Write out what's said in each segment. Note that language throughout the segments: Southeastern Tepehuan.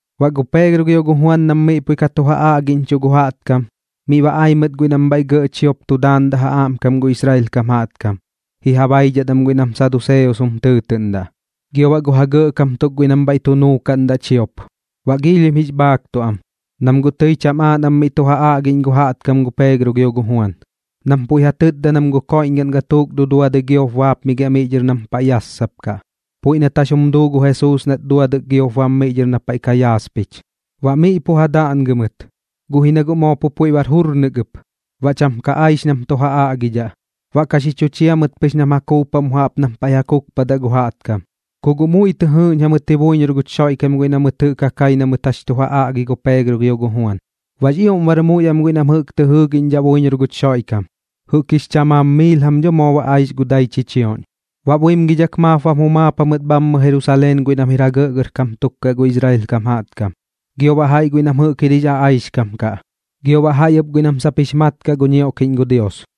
Baꞌ gu Peegro gio gu Juan nam pui miꞌ ka tu ja aꞌgiꞌñchuꞌ gu jaꞌtkam, miꞌ ba ai mɨt guiꞌ nam bhaiꞌ gɇꞌ chiop tu daandaꞌ ja aꞌmkam gu Israel kam jaꞌtkam ji ja baidhat am guiꞌ nam saduseos jum tɨɨtɨꞌndaꞌ gio baꞌ gu ja gɇꞌkam tuk guiꞌ nam bhaiꞌ tu nuukaꞌndaꞌ chiop. Baꞌ giilhim jix bhaaktuꞌ am, nam guꞌ tɨi cham aaꞌ nam miꞌ tu ja aꞌgiꞌñ gu jaꞌtkam gu Peegro gio gu Juan, nam puiꞌ ja tɨtda nam gu koiꞌñgaꞌn gatuuk duduadɨi giop baapmigiaꞌ miꞌ dhɨr nam paiꞌ ka yassapkaꞌ, puiꞌ nat jax jum duu gu Jesuus nat duadɨk giop bam miꞌ dhɨr na paiꞌ ka yaaspich. Ba miꞌ pu ja daꞌngɨ mɨt, guꞌ ji na guꞌ moo pu puiꞌ bar jurnɨk ɨp, baꞌ cham ka aix nam tu ja aꞌgidhaꞌ. Baꞌ ka xi chu chia mɨt pɨx nam ja kuupaꞌ mu jaꞌp nam paiꞌ ja kukpadaꞌ gu jaꞌtkam. Ku guꞌ muiꞌ tɨ jɨɨꞌñ jamɨt ji buiñor guch Xoiꞌkam guiꞌ na mɨt jɨꞌk ja kai na mɨt jax tu ja aꞌgi gu Peegro gio gu Juan. Baꞌx ioꞌm bar muiꞌ am guiꞌ nam jɨꞌk tɨ jɨɨgiꞌñdhaꞌ buiñor guch Xoiꞌkam, jɨꞌk jix chamaam miil jam dho moo aix gu dai chichioꞌñ. Baꞌ buimgidhak maap bam jumaap jamɨt bhammɨ Jerusaleen guiꞌ nam jir ja gɇꞌgɇrkam tuk kaꞌ gu Israel kam jaꞌtkam, gio baꞌ jaiꞌ guiꞌ nam jɨꞌk jir jix aꞌaixkam kaꞌ, gio baꞌ jaiꞌ ɨp guiꞌ nam sap jix mat kaꞌ gu ñioꞌkiꞌñ gu Dios.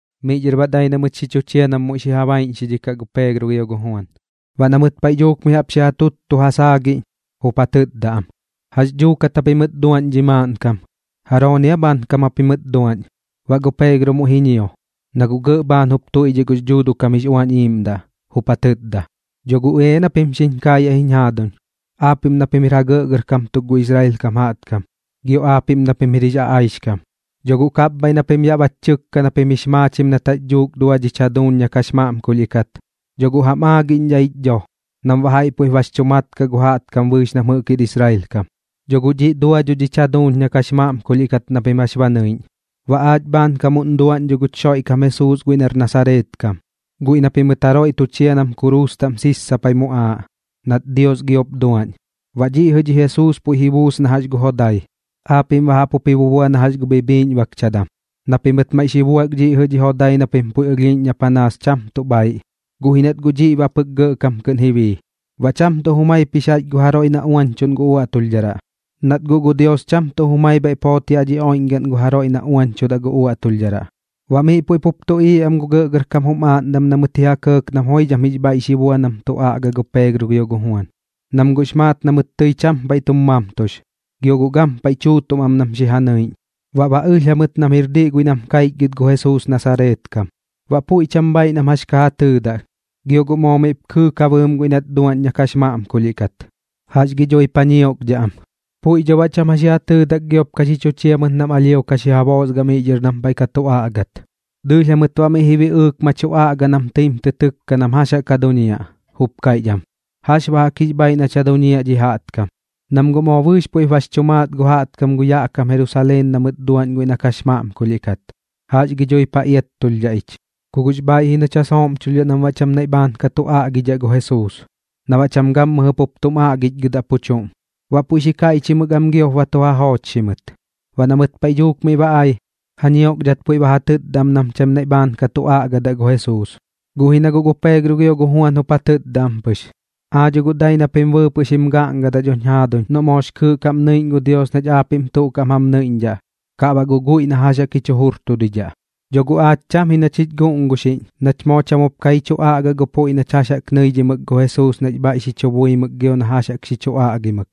Miꞌ dhɨr baꞌ dai na mɨt xi chu chia nam muiꞌ xi ja baiꞌñxidhikaꞌ gu Peegro gio gu Juan. Baꞌ na mɨt paiꞌ dhuuk mi jaꞌp xi ja tuttu ja saagiꞌñ, jup ja tɨtda am: ―¿Jax dhuukat japimɨt duaꞌñ dhi maaꞌnkam? ¿Jarooni aa bhaankam japimɨt duaꞌñ? Baꞌ gu Peegro muiꞌ ji ñio, na guꞌ gɇꞌ bhaan jup tuiꞌdhiꞌ gux Dhuuduꞌ kam jix Uañ Iiꞌmdaꞌ, jup ja tɨtda: ―Dho guꞌ ea na pim xiñ kaayaꞌ jiñ jaaduñ, aapiꞌm na pim jir ja gɇꞌgɇrkam tuk gu Israel kam jaꞌtkam, gio aapiꞌm na pim jir jix aꞌaixkam. Dho guꞌ kapbhaiꞌ na pim yaꞌ bach chɨkka na pim jix maachim nat jax dhuuk dua dhich jaduuñ na kax maꞌmkulhiꞌ kat, dho guꞌ jam aagiꞌñdhaꞌ ich dho nam baꞌ jaiꞌ puiꞌp bax chu mat kaꞌ gu jaꞌtkam bɨɨx nam jɨꞌk jir Israel kam. Dho guꞌ dhiꞌ dua dho dhich jaduuñ na kax maꞌmkulhiꞌ kat na pim jax ba nɨiꞌñ, baꞌ aach bhaankamuꞌn duaꞌñ dho guch Xoiꞌkam Jesuus guiꞌ nar Nasareet kam, guiꞌ na pimɨt jaroiꞌ tu chia nam kuruus taꞌm sissapai muꞌaaꞌ, nat Dios giop duaꞌñ. Baꞌ dhiꞌ jɨꞌ dhi Jesuus puiꞌ ji buus na jax gu jodai, aapiꞌm baꞌ jaꞌp jup ji bubua na jax gu bhibhiꞌñbakchadam, na pimɨt maiꞌ xi buak dhiꞌ jɨꞌ dhi jodai na pim puiꞌ ɨlhiiꞌñ na panaas cham tuꞌ bhaiꞌ, guꞌ ji nat guꞌ dhiꞌ baꞌ pɨk gɇꞌkam kɨꞌn ji bii. Baꞌ cham tuꞌ jumaip jix jaiꞌch guiꞌ na jaroiꞌ uañchuꞌn gu uaꞌtulhdharaꞌ, nat guꞌ gu Dios cham tuꞌ jumai bhaiꞌp joot yaꞌ dhi oiꞌñgaꞌn na jaroiꞌ uañchudaꞌ guch uaꞌtulhdharaꞌ. Baꞌ miꞌ puiꞌ pup tuꞌiiꞌ am gu gɇꞌgɇrkam jum aaꞌndam na mɨt ji ja kɇɇk nam joidham jix bhaiꞌ xi bua nam tu aꞌga gu Peegro gio gu Juan, nam guꞌx maat na mɨt tɨi cham paiꞌ tum mamtux, gio guꞌ gampaiꞌ tuutuꞌm am nam xi ja nɨiꞌñ. Baꞌ ba ɨlh jamɨt nam jir diꞌ guiꞌ nam kaichgɨt gu Jesuus Nasareet kam. Baꞌ puiꞌ cham bhaiꞌ nam jax ka ja tɨɨdaꞌ, gio na guꞌ moo miꞌp kɨɨk ja bɨɨm guiꞌ nat dua na kax maꞌmkulhiꞌ kat, ¿jax gi dhuip ja ñiokdhaꞌ am? Puiꞌ dho baꞌ cham jax ji ja tɨɨdak giop ka xi chu chia mɨt nam alhio ka xi ja boosgaꞌ miꞌ dhɨr nam paiꞌ ka tu aꞌgat. Dɨɨlh jamɨt baꞌ miꞌ ji biꞌɨɨk ma tu aꞌga nam tɨim tɨ tɨkka nam jax jaꞌk ja duñiaꞌ, jup kaiꞌch am: ―¿Jax baꞌ jaꞌk jix bhaiꞌ nach ja duñiaꞌ dhi jaꞌtkam? Nam guꞌ moo bɨɨx puiꞌp bax chu maat gu jaꞌtkam gu yaꞌ kam Jerusaleen na mɨt duaꞌñ guiꞌ na kax maꞌmkulhiꞌ kat. ¿Jax gi dhuip ja iattulhdhaꞌ ich? Ku guꞌx bhaiꞌ ji nach ja sooꞌmchulhdhaꞌ nam baꞌ cham naiꞌ bhaan ka tu aꞌgidhaꞌ gu Jesuus, na baꞌ cham gammɨjɨ pup tum aꞌgichgɨdaꞌ pu chuꞌm. Baꞌ puiꞌ xi kaiꞌchimɨk am giop ba tu ja joochxi mɨt. Baꞌ na mɨt paiꞌ dhuuk miꞌ ba ai, ja ñiokdhat puiꞌ ba ja tɨtda am nam cham naiꞌ bhaan ka tu aꞌgadaꞌ gu Jesuus. Guꞌ ji na guꞌ gu Peegro gio gu Juan jup ja tɨtda am pɨx: ―Aa dho guꞌ dai na pim bɨɨpɨꞌ xim gaꞌngadaꞌ dhoñ jaaduñ noꞌ moox kɨɨꞌ kaꞌm nɨiꞌñ gu Dios nach aapiꞌm tuꞌ kaꞌm jam nɨiꞌñdhaꞌ, kaꞌ baꞌ guꞌ guiꞌ na jax jaꞌk jich jurtudidhaꞌ. Dho guꞌ aach cham ji nach jich guꞌnguxiꞌñ nach moo cham jup ka ji chu aꞌgaꞌ gu puiꞌ nach jax jaꞌk nɨidhimɨk gu Jesuus nax bhaiꞌ xi chu buimɨk gio na jax jaꞌk xi chu aꞌgimɨk.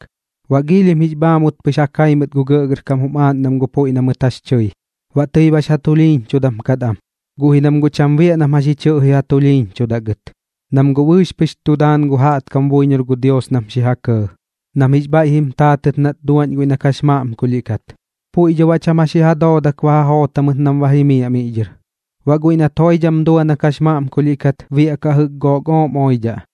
Baꞌ giilhim jix bhaakut pɨx ja kai mɨt gu gɇꞌgɇrkam jum aaꞌndam gu puiꞌ na mɨt jax chɨi. Baꞌ tɨi bax ja tulhiiñchudam kat am, guꞌ ji nam guꞌ cham biaꞌ nam jax ji chɨꞌji ja tulhiiñchudaꞌ gɨt, nam guꞌ bɨɨx pɨx tu daan gu jaꞌtkam buiñor gu Dios nam xi ja kɇɇ, nam jix bhaiꞌ jim taatɨt nat dua guiꞌ na kax maꞌmkulhiꞌ kat. Puiꞌ dho baꞌ cham jax ji ja doodak ba ja joot jamɨt nam ba jimiaꞌ miꞌ dhɨr. Baꞌ guiꞌ nat joidham dua na kax maꞌmkulhiꞌ kat, biaꞌkaꞌ jɨꞌk gook ooꞌm oidhaꞌ.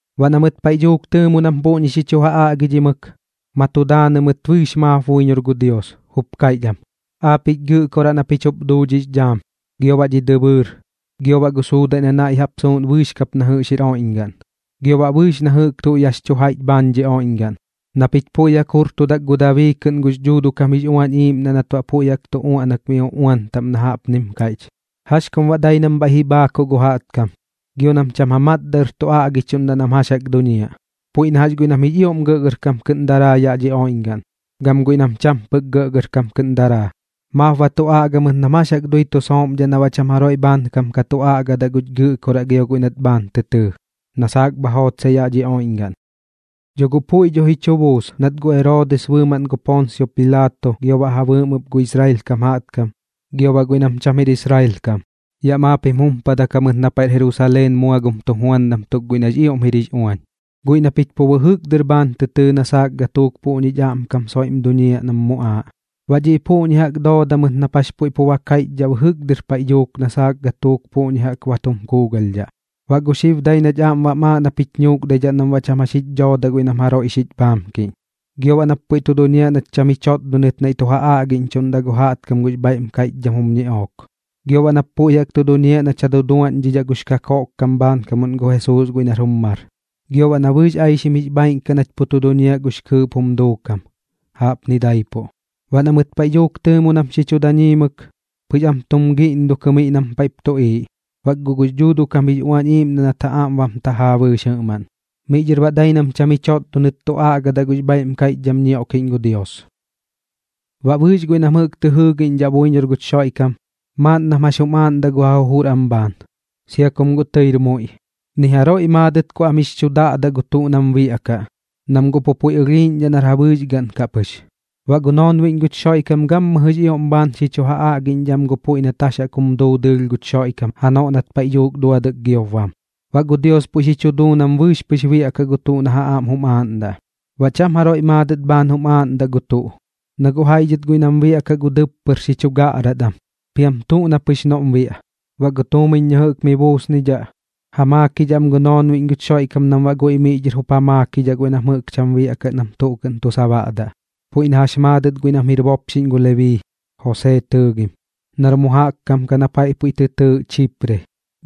Baꞌ na mɨt paiꞌ dhuuk tɨɨmo nam puꞌñi xi chu ja aꞌgidhimɨk, ma tu daanɨ mɨt bɨɨx maap buiñor gu Dios, jup kaiꞌch am: ―Aapiꞌch Gɨꞌkoraꞌ na pich jup duu dhix dhaam, gio baꞌ dhi dɨbɨɨr, gio baꞌ gu suudaiꞌ na naiꞌ suuꞌn bɨɨx kap na jɨꞌx jir oiꞌñgaꞌn, gio baꞌ bɨɨx na jɨꞌk tuꞌ yaꞌx chu jaiꞌch bhaan dhi oiꞌñgaꞌn, na pich puiꞌ jaꞌk jurtudak gu Dabii kɨꞌn gux Dhuuduꞌ kam jix Uañ jum Iiꞌmdaꞌ nat baꞌ puiꞌ jaꞌk tu uaꞌnak mi uꞌuan taꞌm na jaꞌpnim kaiꞌch: ¿Jax kum baꞌ dai nam bhaiꞌ ji bhaakuꞌ gu jaꞌtkam, gio nam cham ja matdaꞌ ɨr tu aꞌgichuꞌndaꞌ nam jax jaꞌk tu duñiaꞌ? Puiꞌ na jax guiꞌ nam jix ioꞌm gɇꞌgɇrkam kɨꞌn daraa yaꞌ dhi oiꞌñgaꞌn, gam guiꞌ nam cham pɨk gɇꞌgɇrkam kɨꞌn daraa, maap ba tu aꞌga mɨt nam jax jaꞌk dui tu sooꞌmdhaꞌ na baꞌ cham jaroiꞌ bhaankam ka tu aꞌgadaꞌ guch Gɨꞌkoraꞌ gio guiꞌ nat bhaan tɨ tɨɨ, na saak bha jootsaꞌ yaꞌ dhi oiꞌñgaꞌn. ’Dho guꞌ puiꞌ dho ji chu buus nat gu Eroodis bɨɨmaꞌn gu Poonsio Pilaato, gio baꞌ ja bɨɨm ɨp gu Israel kam jaꞌtkam, gio baꞌ guiꞌ nam cham jir Israel kam, yaꞌ maap jim jumpadak jamɨt na paiꞌr Jerusaleen mua gum tujuandam tuk guiꞌ nax ioꞌm jir jix uañ, guiꞌ na pich pu bɨjɨk dɨr bhaan tɨ tɨɨ na saak gatuuk puꞌñich aꞌmkam soiꞌm duñiaꞌ nam muꞌaaꞌ. Baꞌ dhiꞌ puꞌñi jaꞌk dooda mɨt nap jax puiꞌ pu ba kaiꞌchdhaꞌ bɨjɨk paiꞌ dhuuk dɨr na saak gatuuk puꞌñi jaꞌk ba tum kuugalhdhaꞌ. Baꞌ gu xib dai nach aꞌm bam aaꞌ nap jich ñuukdaidhaꞌ nam baꞌ cham jax jich dhoodaꞌ guiꞌ nam jaroiꞌ xich bhaamkiꞌñ, gio baꞌ nap puiꞌ tu duñiaꞌ nach cham ji chotdonɨt naiꞌ tu ja aꞌgiꞌñchuꞌndaꞌ gu jaꞌtkam gux bhaiꞌm kaiꞌchdham jum ñiꞌook. Gio baꞌ nap puiꞌ jaꞌk jup tu duñiaꞌ nach ja duduadhiꞌñdhaꞌ gux kakoꞌkkam bhaankamuꞌn gu Jesuus guiꞌ nar jum mar, gio baꞌ na bɨɨx aixim jix bhaaiꞌn kaꞌ nach pu tu duñiaꞌ gux kɨɨꞌp jum duukam. Jaꞌpni daipuꞌ. Baꞌ na mɨt paiꞌ dhuuk tɨɨmo nam xi chu daañimɨk, pɨx am tum giꞌndukɨ miꞌ nam paiꞌp tuꞌiiꞌ, bak guꞌ gux Dhuuduꞌ kam jix Uañ Iiꞌmdaꞌ nat ja aꞌm bam tajaa bɨɨx jɨꞌmaꞌn. Miꞌ dhɨr baꞌ dai nam cham ji chotdonɨt tu aꞌgadaꞌ gux bhaiꞌm kaiꞌchdham ñioꞌkiꞌñ gu Dios. Baꞌ bɨɨx guiꞌ nam jɨꞌk tɨ jɨɨgiꞌñdhaꞌ buiñor guch Xoiꞌkam, maaꞌn nam jax jum aaꞌndaꞌ gu ja jujur am bhaan, sia kum guꞌ tɨir muiꞌ. Ni jaroiꞌ maadɨt ku am jix chu daꞌdaꞌ gu tuꞌ nam biaꞌkaꞌ, nam guꞌ puiꞌ ɨlhiiꞌñdhaꞌ nar ja bɨɨx gaꞌn kaꞌ pɨx. Baꞌ gu noonbiꞌñ guch Xoiꞌkam gammɨjɨx ioꞌm bhaan xi chu ja aꞌgiꞌñdhaꞌ am gu puiꞌ nat jax jaꞌk jum duu dɨɨlh guch Xoiꞌkam janoꞌ nat paiꞌ dhuuk duadɨk giop bam. Baꞌ gu Dios puiꞌ xi chu duu nam bɨɨx pɨx biaꞌkaꞌ gu tuꞌ na ja aꞌm jum aaꞌndaꞌ. Baꞌ cham jaroiꞌ maadɨt bhaan jum aaꞌndaꞌ gu tuꞌ, na guꞌ jaiꞌ dhɨt guiꞌ nam biaꞌkaꞌ gu dɨppɨr xi chu gaꞌrat am, piam tuꞌ na pɨx noꞌm biaꞌ. Baꞌ gu tuumiñ na jɨꞌk mi buusnidhaꞌ, ja maakidhaꞌ am gu noonbiꞌñ guch Xoiꞌkam nam baꞌ guiꞌ miꞌ dhɨr jup ja maakidhaꞌ guiꞌ nam jɨꞌk cham biaꞌkaꞌ nam tuꞌ kɨꞌn tu sabaꞌdaꞌ. Puiꞌ na jax maadɨt guiꞌ nam jir bopxiꞌñ gu Lebii, Josee tɨɨgim, nar mu jaꞌk kam kaꞌ na paiꞌ puiꞌ tɨ tɨɨꞌ Chipre,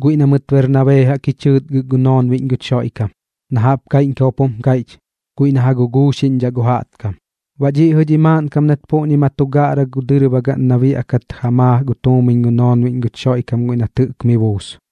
guiꞌ na mɨt Bernabee jaꞌk ji chɨɨtgɨk gu noonbiꞌñ guch Xoiꞌkam, na jaꞌp kaiꞌñkam jup jum kaiꞌch: Guiꞌ na ja guguuxiꞌñdhaꞌ gu jaꞌtkam. Baꞌ dhiꞌ jɨꞌ dhi maaꞌnkam nat puꞌñi ma tu gaꞌra gu dɨrbagaꞌn na biaꞌkat ja maa gu tuumiñ gu noonbiꞌñ guch Xoiꞌkam guiꞌ nat jɨꞌk mi buus.